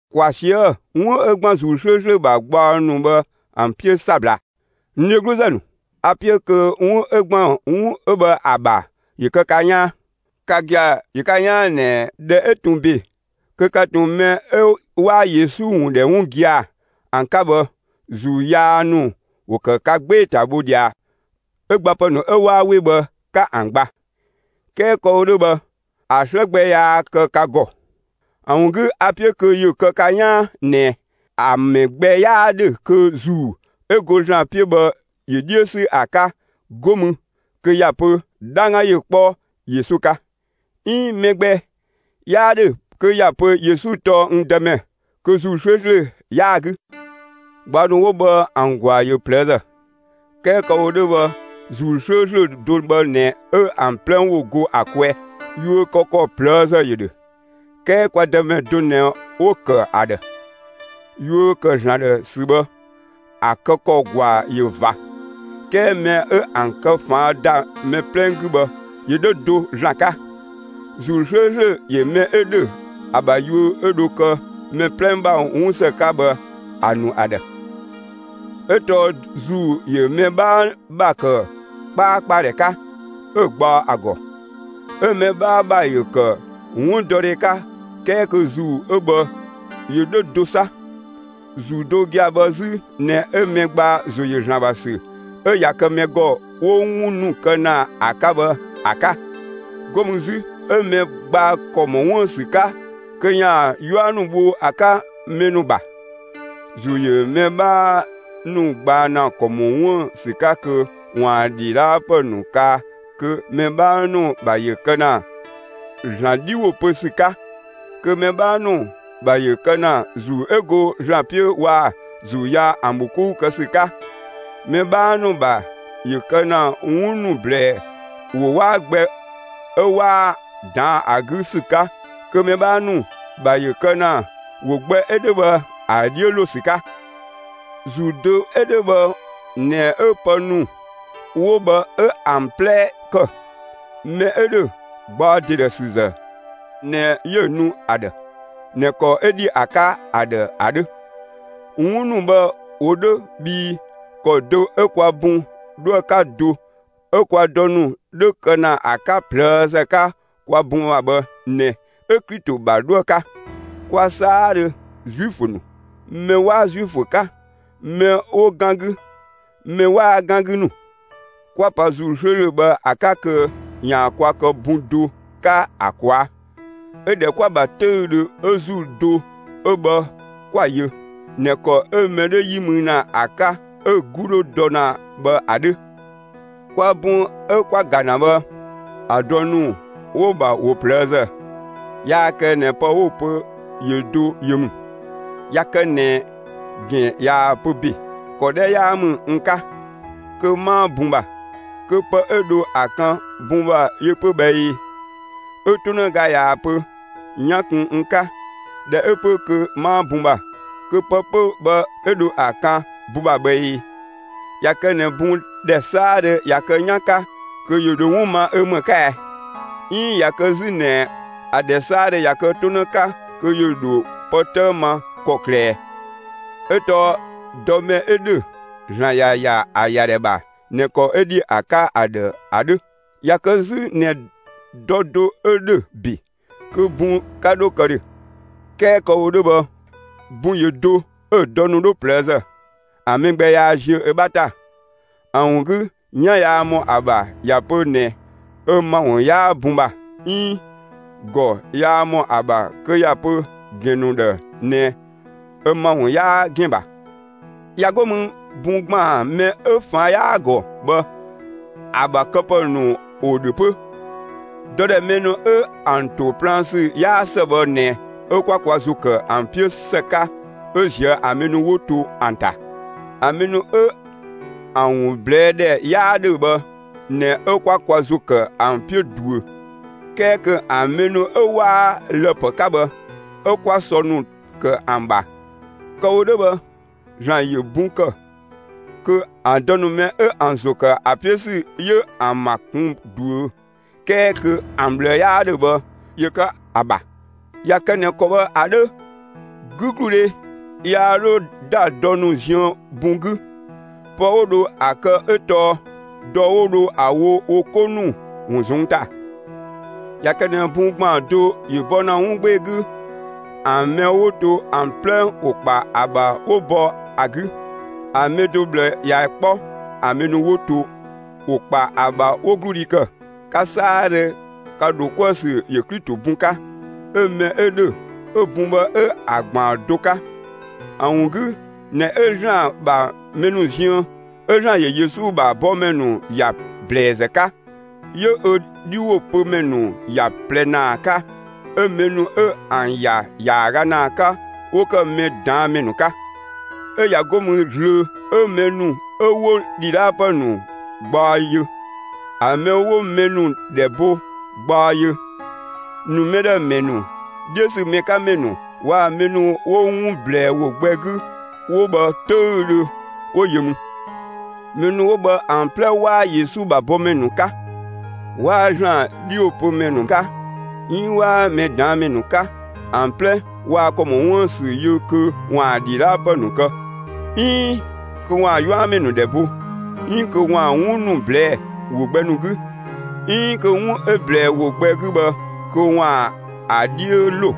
‑Kwa ꞊sië'‑ 'wun 'ö ‑gban ‑Zuu 'slööslö ‑bha gbaɔ ‑nu bhë ‑an 'piö 'sabla. N dhegluzë ‑nu, a‑ 'piö kö 'wun 'ö ‑gban 'wun bhë ‑a ‑bha ‑yö kë ka 'yaan. Ka gia‑ ‑yö ka 'yaan ꞊nɛ ꞊dhɛ 'ö ꞊tun ‑be kö ka ꞊tun mɛ 'ö waa Yesu ‑wun ‑dhɛ 'wun gia‑ ‑an 'ka bhë, ‑zuu yaa ‑nu ‑wo kë ka 'gbee‑ ‑ta bho ꞊dhia 'ö gbapë ‑nu 'ö 'waa 'we bhë 'ka ‑an ‑gba; 'kɛɛ kë‑ wo 'dhö bhë, ‑a 'slë gbɛ yaa kë ka ‑gɔ. ‑A ‑wun 'gü, a‑ 'piö kö ‑yö kë ka 'yaan ꞊nɛ: ‑A mɛ gbɛ 'yaa ‑dhö kö ‑Zuu 'ö go ‑Zlan 'piö bhë ‑yö 'dhiö 'sü ‑a 'ka, 'go mü kö ‑ya pö: «'Dhangga ‑yö 'kpɔ Yesu 'ka!» 'iin mɛ gbɛ 'yaa ‑dhö kö ‑ya pö Yesu tɔɔ ö Dëmɛ, kö ‑Zuu 'slööslö 'yaa‑ 'gü. Gbaɔ ‑nu 'wo bhë ‑an ‑gwaa ‑yö ꞊plëëzë. 'Kɛɛ kë‑ wo 'dhö bhë ‑Zuu 'slööslö do bhë ꞊nɛ 'ö ‑an 'plɛ ‑wo go ‑a kwɛɛ. Yuö kë ‑kɔ ꞊plëëzë ‑yö ‑dhö, 'kɛɛ kwa Dëmɛ do ꞊nɛ 'wo‑ ‑kë ‑a ‑dhë. Yuö ‑kë ‑Zlan ‑dhë ‑sü bhë, ‑a kë ‑kɔ ‑gwaa ‑yö ꞊va. 'Kɛɛ mɛ 'ö ‑an kë ꞊faan' ‑da mɛ 'plɛ 'gü bhë, ‑yö 'dhö do ‑Zlan 'ka. ‑Zuu 'slööslö ‑yö mɛ 'ö ‑dhö ‑a ‑bha yuö 'ö dho kë mɛ 'plɛ ‑bha 'wunsë 'ka bhë ‑a ‑nu ‑a ‑dhë. 'Ö tɔɔ ‑Zuu ‑yö mɛ 'bhaa ‑bha ‑kë 'kpaakpadhɛ 'ka 'ö‑ gbaɔ ‑a ‑gɔ, 'ö mɛ 'bhaa ‑bha ‑yö ‑kë 'wundɔdhe 'ka 'kɛɛ kö ‑Zuu ö bhë ‑yö 'dhö do 'sa. ‑Zuu do gia‑ bhë 'zü ꞊nɛ 'ö mɛ gbaa ‑zo ‑yö ‑Zlan ‑bha ‑sü ('ö ꞊ya kë mɛ ‑gɔ 'wo 'wun ‑nu kë ‑na ‑a 'ka bhë ‑a) 'ka; 'go mü 'zü 'ö mɛ gbaa ‑kɔ ‑mɔ 'wuën‑ ‑sü 'ka kö ‑yaan 'yua ‑nu bho ‑a 'ka mɛ ‑nu ‑bha. ‑Zuu ‑yö mɛ 'bhaa ‑nu gbaa ‑na ‑kɔ ‑mɔ 'wuën‑ ‑sü 'ka kö ‑waan ‑dhidhaapë ‑nu kaa kö mɛ 'bhaa ‑nu ‑bha ‑yö kë ‑na ‑Zlan 'dhi ‑wo pö ‑sü 'ka; kö mɛ 'bhaa ‑nu ‑bha ‑yö kë ‑na ‑Zuu 'ö go ‑Zlan 'piö waa‑ ‑zuu yaa ‑an ‑bho 'kou kë ‑sü 'ka. Mɛ 'bhaa ‑nu ‑bha ‑yö kë ‑na 'wun ‑nu ‑blɛɛ ‑wo 'waa gbɛ 'ö 'waa‑ ꞊daan' ‑a 'gü ‑sü 'ka, kö mɛ 'bhaa ‑nu ‑bha ‑yö kë ‑na ‑wo gbɛ 'ö 'dhö bhë ‑a 'dhiö ‑lo ‑sü 'ka. ‑Zuu do 'ö 'dhö bhë ꞊nɛ 'ö pë ‑nu 'wo bhë 'ö ‑an 'plɛ ‑kë. Mɛ 'ö ‑dhö gbaɔ ‑de ‑dhë ‑zë ꞊nɛ 'yö‑ nu ‑a ‑dhë ꞊nɛ ‑kɔ 'ö ‑dhi ‑a 'ka ‑a ‑dhë ‑a 'dhö. 'Wun ‑nu bhë ‑wo 'dhö bhii ‑kɔ do 'ö kwa bun 'dhoë‑ 'ka do 'ö kwa dɔ ‑nu 'dhö kë ‑na 'ka ꞊plëëzë 'ka kwa bun ‑bha bhë ꞊nɛ 'ö Klito ‑bha 'dhoë‑ 'ka. Kwa 'saadhö, Zuifö ‑nu, mɛ 'waa Zuifö 'ka, mɛ 'wo 'gan 'gü, mɛ 'waa 'gan 'gü ‑nu, 'kwa pa ‑Zuu 'slööslö bhë ‑a 'ka kö ‑yaan kwa kë bun do 'ka ‑a ꞊kwaa', 'ö ‑dhɛ 'kwa‑ ‑bha 'töüdhö 'ö ‑Zuu do 'ö bhë 'kwa‑ yö (꞊nɛ ‑kɔ 'ö mɛ 'dhö 'yi mü ‑na ‑a 'ka 'ö‑ 'gu 'dhö dɔ ‑na bhë ‑a 'dhö). Kwa bun 'ö 'ka‑ ‑ga ‑na bhë, ‑a dɔ ‑nu 'wo‑ ‑bha ‑wo ꞊plëëzë; yaa kë ꞊nɛ pë 'wo‑ pö ‑yö do yö ‑mü. ꞊Ya kë ꞊nɛ ‑gɛn ꞊yaa‑ pö ‑be: «‑Kɔ 'dhɛ 'yaa ‑mü n 'ka, kö 'maa bun ‑bha.» Kö pë 'ö dho ‑a kan bun ‑bha yö 'pö bhë ꞊ee? 'Ö 'tonëga ꞊yaa‑ pö: «'Yan kun n 'ka; ꞊dhɛ 'ö 'pö, kö 'maa bun ‑bha.» Kö pë 'pö bhë 'ö dho ‑a kan bun ‑bha bhë ꞊ee? ꞊Ya kë ꞊nɛ bun ‑dhɛ 'saadhö ꞊ya kë 'yan 'ka, kö ‑yö ‑dho 'wun ma ö ‑më 'ka ɛɛ? 'Iin ꞊ya kë 'zü ꞊nɛ ‑a ‑dhɛ 'saadhö ꞊ya kë 'tonë 'ka, kö ‑yö ‑dho pë 'tëë ma ‑kɔklë ꞊ɛ? 'Ö tɔɔ dɔ mɛ 'ö ‑dhö, ‑Zlan ‑ya ‑ya ‑a ‑yadhɛ ‑bha ꞊nɛ ‑kɔ 'ö ‑dhi ‑a 'ka ‑a ‑dhë ‑a 'dhö. ꞊Ya kë 'zü ꞊nɛ dɔ do 'ö ‑dhö ‑be, kö bun 'ka 'dho kë ‑dhö. 'Kɛɛ kë‑ wo 'dhö bhë bun ‑yö do 'ö‑ dɔ ‑nu 'wo ꞊plëëzë. ‑A mɛ gbɛ yaa ziö ö 'bha ‑ta. ‑A ‑wun 'gü 'yan yaa ‑mɔ ‑a ‑bha ꞊ya pö ꞊nɛ ö ‑mawun 'yaa bun ‑bha; 'iin ‑gɔ yaa ‑mɔ ‑a ‑bha kö ‑ya pö ‑gɛn ‑nu ‑dhë ꞊nɛ ö ‑mawun 'yaa ‑gɛn ‑bha. ꞊Ya 'go mü bun ‑gbaan mɛ 'ö ꞊faan' 'yaa‑ ‑gɔ bhë, ‑a ‑bha këpë ‑nu ‑wo ‑dhö 'pö. Dɔ ‑dhɛ mɛ ‑nu 'ö ‑an ‑to plaan ‑sü 'yaa ‑së bhë ꞊nɛ 'ö 'kwa kwa ‑zo ‑kë ‑an 'piö ‑së 'ka 'ö ꞊zië' ‑an mɛ ‑nu 'wo to ‑an ‑ta. ‑An mɛ ‑nu 'ö ‑an ‑wun ꞊blɛɛ' ‑dhɛ 'yaa ‑dhö bhë ꞊nɛ 'ö 'kwa kwa ‑zo ‑kë ‑an 'piö ꞊duö. 'Kɛɛ kö ‑an mɛ ‑nu 'ö 'waa lë‑ ‑pë 'ka bhë, 'ö 'kwaa sɔ ‑nu kë ‑an ‑bha. Kë‑ wo 'dhö bhë, ‑Zlan ‑yö bun ‑kë, kö ‑a dɔ ‑nu mɛ 'ö ‑an ‑zo ‑kë ‑an 'piö ‑sü ‑yö ‑an ‑ma kun ꞊duö 'kɛɛ kö ‑an ꞊bhlë 'yaa ‑dhö bhë ‑yö kë ‑a ‑bha. ꞊Ya kë ꞊nɛ ‑kɔ bhë ‑a 'dhö, 'gügludhe yaa 'dho ‑da dɔ ‑nu ziën bun 'gü. Pë 'wo dho ‑a kë 'ö tɔɔ, dɔ 'wo dho ‑a wo wo 'ko ‑nu ‑wun ꞊zɔnng' ‑ta. ꞊Ya kë ꞊nɛ bun ‑gbaan do ‑yö bɔ ‑na 'wun 'gbee‑ 'gü, ‑an mɛ 'wo to ‑an 'plɛ ‑wo ‑kpa ‑a ‑bha 'wo bɔ ‑a 'gü. ‑A mɛ do ꞊bhlë ꞊ya 'kpɔ, ‑an mɛ ‑nu 'wo to ‑wo ‑kpa ‑a ‑bha 'wo 'gludhi ‑kë. Ka 'saadhö, ka ‑dho 'kuë‑ ‑sü ‑yö Klito bun 'ka, 'ö mɛ 'ö ‑dhö 'ö bun bhë 'ö ‑a ‑gbaan do 'ka. ‑A ‑wun 'gü ꞊nɛ 'ö ‑Zlan ‑bha mɛ ‑nu ziën, 'ö ‑Zlan ‑yö Yesu ‑bha bɔmɛ ‑nu ‑ya ‑blɛɛzë 'ka; 'yö ö 'dhiwopömɛ ‑nu ‑ya ꞊plɛ ‑naa 'ka, 'ö mɛ ‑nu 'ö ‑an ‑ya ‑yaaga ‑naa 'ka, 'wo ‑kë mɛ ꞊daan' ‑mɛ ‑nu 'ka. 'Ö ꞊ya 'go mü zlöö, 'ö mɛ ‑nu 'ö 'wo ‑dhidhaakëpë ‑nu gbaɔ yö, ‑a mɛ 'wo mɛ ‑nu ‑dhɛ bo gbaɔ yö, ‑nu mɛ ‑dhë ‑mɛ ‑nu, 'dhiö ‑sü mɛ 'ka ‑mɛ ‑nu waa‑ mɛ ‑nu 'wo 'wun ꞊blɛɛ ‑wo gbɛ 'gü 'wo bhë 'töüdhö 'wo yö mü. Mɛ ‑nu 'wo bhë ‑an 'plɛ 'waa Yesu ‑bha bɔmɛ ‑nu 'ka, 'waa ‑Zlan 'dhiwopömɛ ‑nu 'ka 'iin 'waa mɛ ꞊daan' ‑mɛ ‑nu 'ka. ‑An 'plɛ waa ‑kɔ ‑mɔ 'wuën‑ ‑sü yö kö ‑waan ‑dhidhaapë ‑nu kë, 'iin kö ‑waan 'yuamɛ ‑nu ‑dhɛ bo, 'iin kö ‑waan 'wun ‑nu ꞊blɛɛ'‑ ‑wo gbɛ ‑nu 'gü, 'iin kö 'wun 'ö ꞊blɛɛ ‑wo gbɛ 'gü bhë kö ‑waan ‑a 'dhiö ‑lo.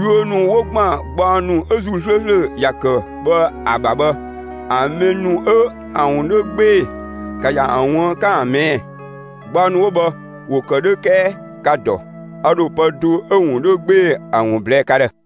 Yuö ‑nu 'wo ‑gban gbaɔ ‑nu 'ö ‑Zuu 'slööslö ‑ya kë bhë ‑a ‑bha bhë, ‑an mɛ ‑nu 'ö ‑an ‑wun 'dhö 'gbee‑, ‑ka ‑ya ‑an ꞊wuën', 'ka ‑an ꞊mɛɛ'‑! Gbaɔ ‑nu 'wo bhë ‑wo ‑kë 'dhö 'kɛɛ ‑ka dɔ! A ‑dho pë do 'ö‑ ‑wun 'dhö 'gbee‑ ‑a ‑wun ꞊blɛɛ' ka ‑dhë.